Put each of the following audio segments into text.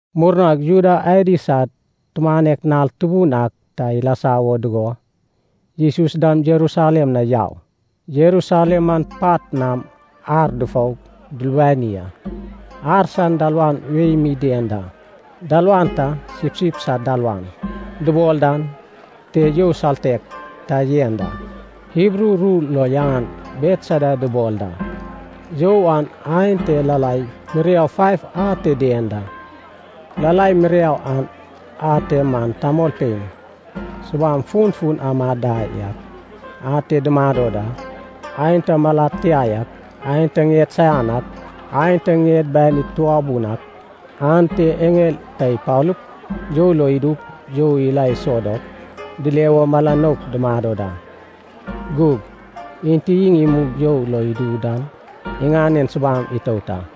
Murnag Juda adi sad tumanek nal tubun ak ta ilasa wo dugo, Jesus dam Jerusalem na yau. Jerusalem man pat nam ar dufou dulubani a. Ar san dalawan wei mi dien da. Dalawan ta “sipsip sad dalawan” dubol dan te you saltek ta yen da, Hibru ru lo yaŋan Betesda dubol da. You an aen te lalai miriau faiv ate dien da. Lalai miriau an ate man tamolpein subam funfun amad da yak ate dumado da. Aenta malad tia yak, aenta ŋied saian ak, aenta ŋied banid tubabun ak, ante eŋel ta ipalup, you lo idup you ila iso dop, dile wo mala nouk dumado da. Gug enti iŋ imug you lo idu dan iŋanen subam itout a.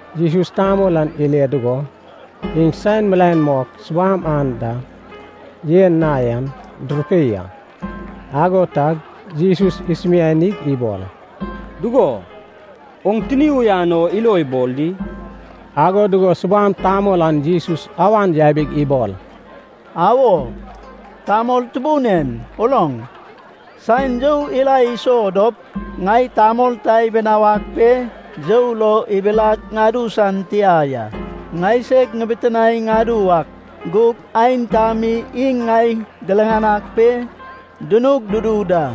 Jesus tamol an ile dugo, iŋ saen milaen mok subam anda yen na yan durupei a. Ago tag Jesus isumianig ibol, “Dugo, oŋ tini uyan o ilo ibol di?” Ago dugo subam tamol an Jesus awan yabig ibol, “Awo. Tamol tubun en, uloŋ, saen you ila iso dop, ŋai tamol ta ibinawag pe, you lo ibilag ŋadu san tia ya. Ŋaiseg ŋibitinae ŋadu wak, gug aenta mi iŋ ŋai diriŋanag pe dunug dudu da.”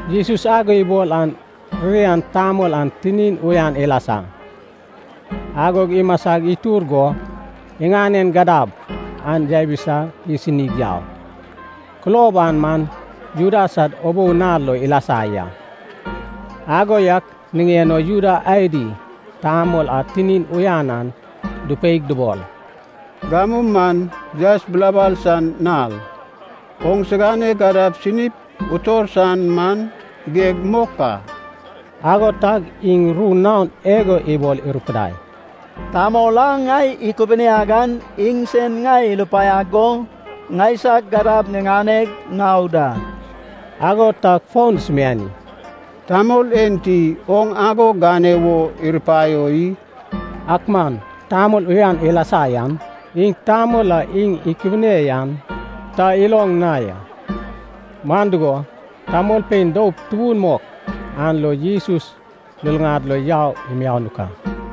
Jesus ago ibol an ririan tamol an tinin uyan ilasa, agog imasa itur go iŋanen gadab an yabisa isinig yau. Kulob an man Juda sad ubou nal lo ilasa ya. Ago yak niŋen o Juda adi tamol a tinin uyan an dupeig dubol, “Gamu man yaes bilabal san nal, oŋsigane gadab sinip utor san man geg mok a.” Ago tag iŋ ru naon igo ibol irupudai, “Tamol a ŋai ikubuniag an iŋsen ŋai irupaiag go ŋaisag gadab ŋiŋaneg ŋau da.” Ago tag fon dusumiani, “Tamol enti oŋ ago gane wo irupaio i?” Ak man tamol uyan ilasa an iŋ tamol a iŋ ikubune yan ta iloŋ na ya. Man dugo, tamolpein doup tubun mok an lo Jesus luluŋad lo yau imianuk a.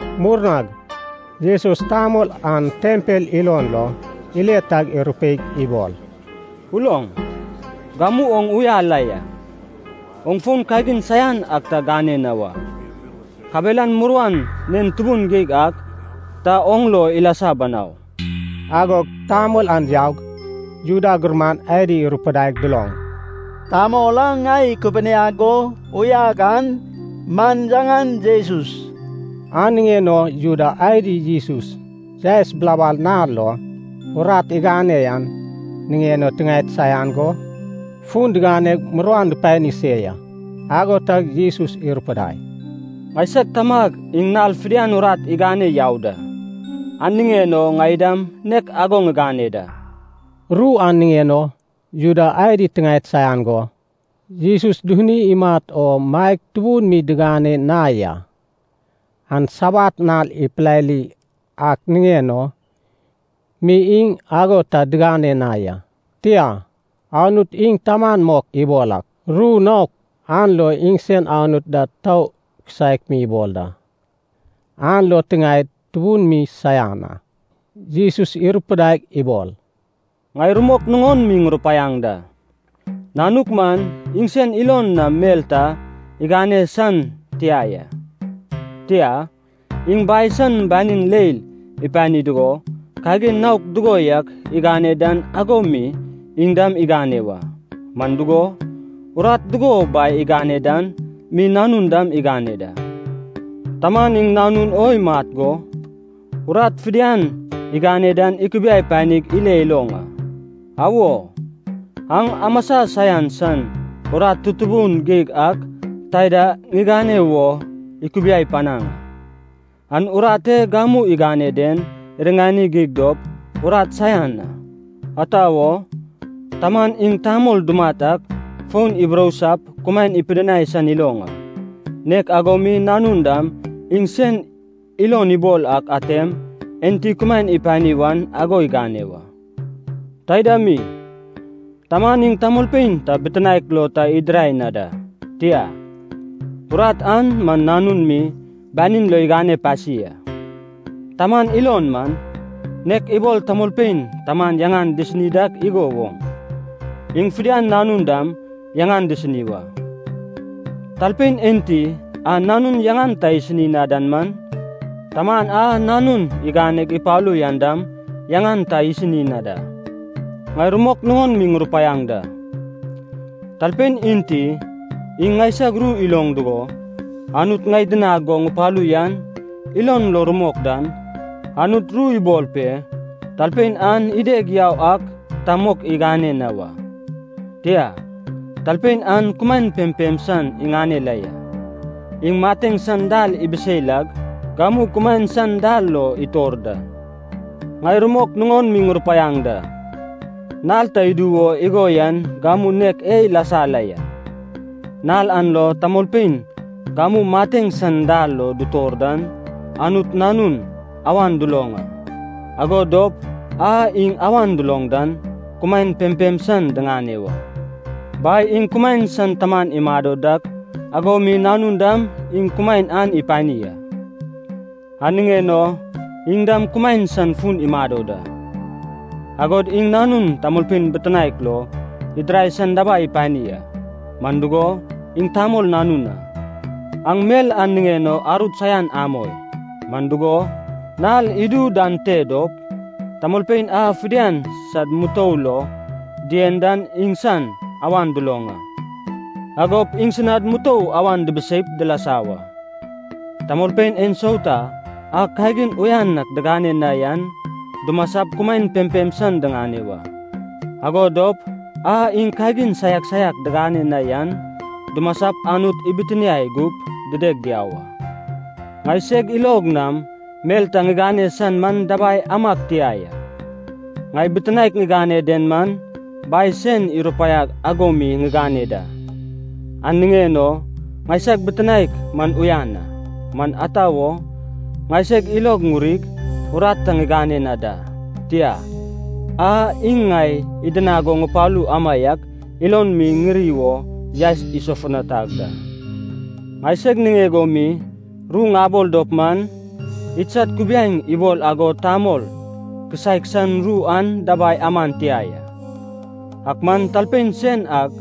Murnag Jesus tamol an tempel ilon lo ile tag irupeig ibol, “Uloŋ, gamu oŋ uya la ya. Oŋ fon kagin saian ak ta gane na wa. Kabelan muruan nen tubun geig ak ta oŋ lo ilasa banau.” Agog tamol an yaug, Juda gurman adi irupudai duloŋ, “Tamol a ŋai ikubuniag go uyag an man yaŋan Jesus.” An niŋen o Juda adi Jesus yaes bilabal nal lo urat igane an niŋen o tiŋaed saian go fun diganeg muruan dupani se ya. Ago tag Jesus irupudai, “Ŋaisag Tamag iŋ nal fidian urat igane yau da, an niŋen o ŋai dam nek ago ŋigane da.” Ru an niŋen o Juda adi tiŋaed saian go, Jesus dufuni imat o maeg tubun mi digane na ya. An sabat nal ipilali ak niŋen o mi iŋ ago ta digane na ya, tia, Anut iŋ taman mok ibol ak, ru naok an lo iŋsen Anut da tou kisaek mi ibol da, an lo tiŋaed tubun mi saian a. Jesus irupidaig ibol, “Ŋai rumok nuŋon mi ŋurupaiaŋ da, Nanuk man iŋ sen ilon nam mel ta igane san tia ya. Tia, iŋ Bai san banin leil ipani dugo, kagin naok dugo yak igane dan ago mi iŋ dam igane wa. Man dugo, urat dugo Bai igane dan mi Nanun dam igane da. Taman iŋ Nanun o imat go, urat fidian igane dan ikubiai panig ile iloŋ a. Awo, aŋ amasa saian san urat tutubun geig ak taida ŋigane wo ikubiai panag a. An urat e gamu igane den iriŋani geig dop arut saian a. Ata wo? Taman iŋ tamol dumat ak fon iburousap kumaen ipidinai san iloŋ a. Nek ago mi Nanun dam iŋ sen ilon ibol ak atem, enti kumaen ipani wan ago igane wa. Taida mi, Taman iŋ tamolpein ta bitinaek lo ta idirai na da. Tia, urat an man Nanun mi banin lo igane pasi a. Taman ilon man, nek ibol tamolpein Taman yaŋan disini dak igo woŋ, iŋ fidian Nanun dam yaŋan disini wa. Talpein enti a Nanun yaŋan ta isini na dan man, Taman a Nanun iganeg ipalu yan dam yaŋan ta isini na da. “Ŋai rumok nuŋon mi ŋurupaiaŋ da. Talpein enti iŋ ŋaisag ru iloŋ dugo, Anut ŋai idinag go ŋupalu yan ilon lo rumok dan, Anut ru ibol pe talpein an ideg yau ak ta mok igane na wa. Tia, talpein an kumaen pempem san iŋane la ya, iŋ mateŋ san dal ibisei lag, gamu kumaen san dal lo itor da. Ŋai rumok nuŋon mi ŋurupaiaŋ da, nal ta idu wo igo yan gamu nek e ilasa la ya. Nal an lo tamolpein gamu mateŋ san dal lo dutor dan Anut Nanun awan duloŋ a, ago dop a iŋ awan duloŋ dan, kumaen pempem san diŋane wa. Bai iŋ kumaen san taman imado dak ago mi Nanun dam iŋ kumaen an ipani a, an niŋen o iŋ dam kumaen san fun imado da. Agod iŋ Nanun tamolpein bitinaek lo idirai san dabai ipani a, man dugo, iŋ Tamol Nanun a. “Aŋ mel an niŋen o arut saian amoi, man dugo, nal idu dan te dop, tamolpein a fidian sad mutou lo dien dan iŋsan awan duloŋ a, agop iŋsinad mutou awan dibiseip dilasa wa. Tamolpein ensauta a kagin uyan ak digane na yan dumasap kumaen pempem san diŋane wa, ago dop a iŋ kagin saiak saiak digane na yan dumasap Anut ibitiniai gup dideg diau a. Ŋai seg ilog nam mel ta ŋigane san man dabai amag tia ya. Ŋai bitinaek ŋigane den man Bai sen irupaiag ago mi ŋiŋane da, an niŋen o ŋaisag bitinaek man uyan a. Man ata wo, ŋaiseg ilog ŋurig, urat ta ŋigane na da, tia, a iŋ ŋai idinag go ŋupalu amaiak ilon mi ŋiri wo yaes isofutanag da. “Ŋaiseg niŋeg o mi ru ŋabol dop man, idsad kubiaeŋ ibol ago tamol kisaek san ru an dabai aman tia ya. Ak man talpein sen ak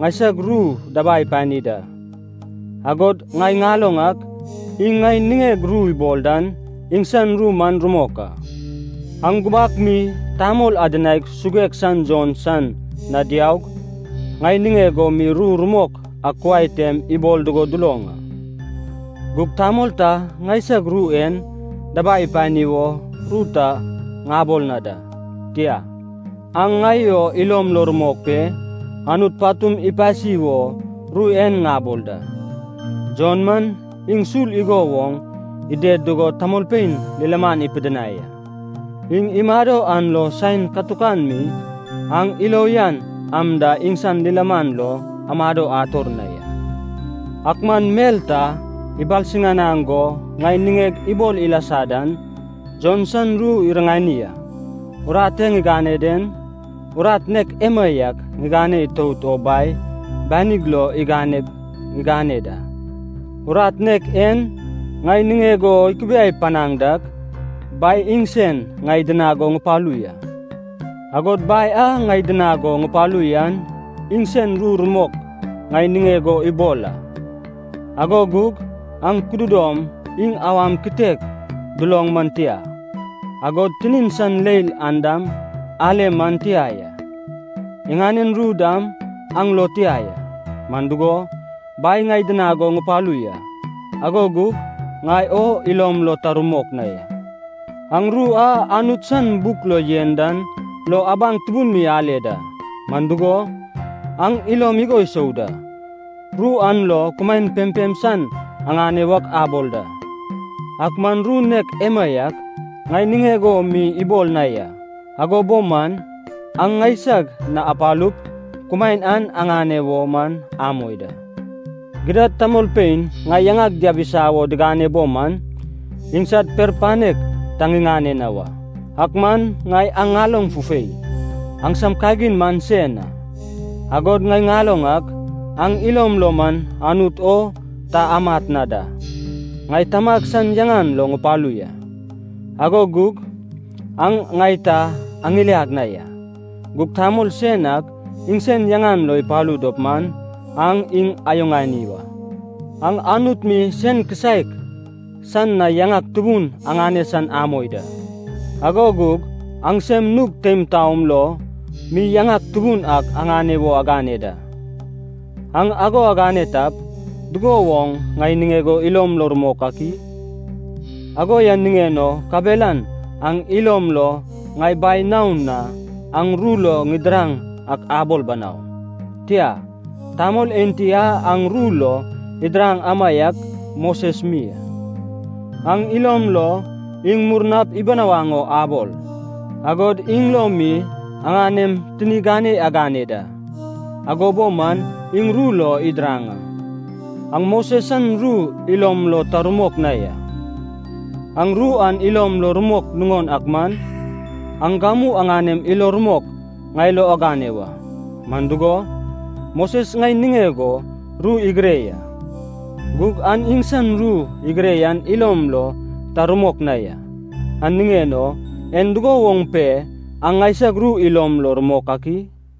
ŋaisag ru dabai ipani da, agod ŋai ŋaloŋ ak iŋ ŋai niŋeg ru ibol dan iŋsan ru man rumok a. “Aŋ gubak mi tamol adinaig suguek san Jon san na diaug, ŋai niŋeg o mi ru rumok ak kuai tem ibol dugo duloŋ a. Gug tamol ta ŋaisag ru en dabai ipani wo ru ta ŋabol na da, tia, aŋ ŋai o ilom lo rumok pe, Anut patum ipasi wo ru en ŋabol da. Jon man iŋ sul igo woŋ ided dugo tamolpein lilaman ipidinai a. Iŋ imado an lo saen katukan mi aŋ ilo uyan am da iŋsan lilaman lo amado ator na ya. “Ak man mel ta ibalsiŋanag go ŋai niŋeg ibol ilasa dan, Jon san ru iriŋani a. Urat e ŋigane den, urat nek emaiak ŋigane itout o Bai banig lo iganeg ŋigane da. Urat nek en ŋai niŋeg o ikubiai panaŋ dak, Bai iŋsen ŋai idinag go ŋupalu ya. Agod Bai a ŋai idinag go ŋupalu yan iŋsen, ru rumok ŋai niŋeg o ibol a. Ago gug aŋ kududom iŋ awan kitek duloŋ man tia, agod tinin san leil an dam ale man tia ya. Iŋanen ru dam aŋ lo tia ya. Man dugo, Bai ŋai idinag go ŋupalu ya, ago gug ŋai o ilom lo ta rumok na ya. Aŋ ru a Anut san buk lo yen dan lo abaŋ tubun mi ale da, man dugo, aŋ ilom igo isou da, ru an lo kumaen pempem san aŋane wak abol da. Ak man ru nek emaiak ŋai niŋeg o mi ibol na ya. Ago bo man, aŋ ŋaisag na apalup, kumaen an aŋane wo man amoi da. “Gidad tamolpein ŋai yaŋag diabisa wo digane bo man, iŋsad per panek ta ŋiŋane na wa. Ak man ŋai aŋ ŋaloŋ fufei, aŋsam kagin man sen a. Agod ŋai ŋaloŋ ak, aŋ ilom lo man Anut o ta amat na da. Ŋai Tamag san yaŋan lo ŋupalu ya. Ago gug aŋ ŋai ta aŋiliag na ya. Gug tamol sen ak iŋsen yaŋan lo ipalu dop man, aŋ iŋ ayuŋani wa. Aŋ Anut mi sen kisaek san na yaŋak tubun aŋane san amoi da, ago gug aŋsem nug teim taom lo mi yaŋak tubun ak aŋane wo agane da. Aŋ ago agane tap, dugo woŋ ŋai niŋeg o ilom lo rumok ak i? “Ago yan niŋen o kabelan aŋ ilom lo ŋai Bai naon na aŋ ru lo ŋidiraŋ ak abol banau. Tia, tamol enti a aŋ ru lo idiraŋ amaiak Moses mi a. Aŋ ilom lo iŋ murnap ibinawaŋ o abol, agod iŋ lo mi aŋanem tini gane agane da. Ago bo man, iŋ ru lo idiraŋ a. Aŋ Moses san ru ilom lo ta rumok na ya. Aŋ ru an ilom lo rumok nuŋon ak man, aŋ gamu aŋanem ilo rumok ŋai lo agane wa. Man dugo, Moses ŋai niŋeg o ru igire ya. Gug aŋ iŋsan ru igire yan ilom lo ta rumok na ya, an niŋen o, en dugo woŋ pe aŋ ŋaisag ru ilom lo rumok ak i?”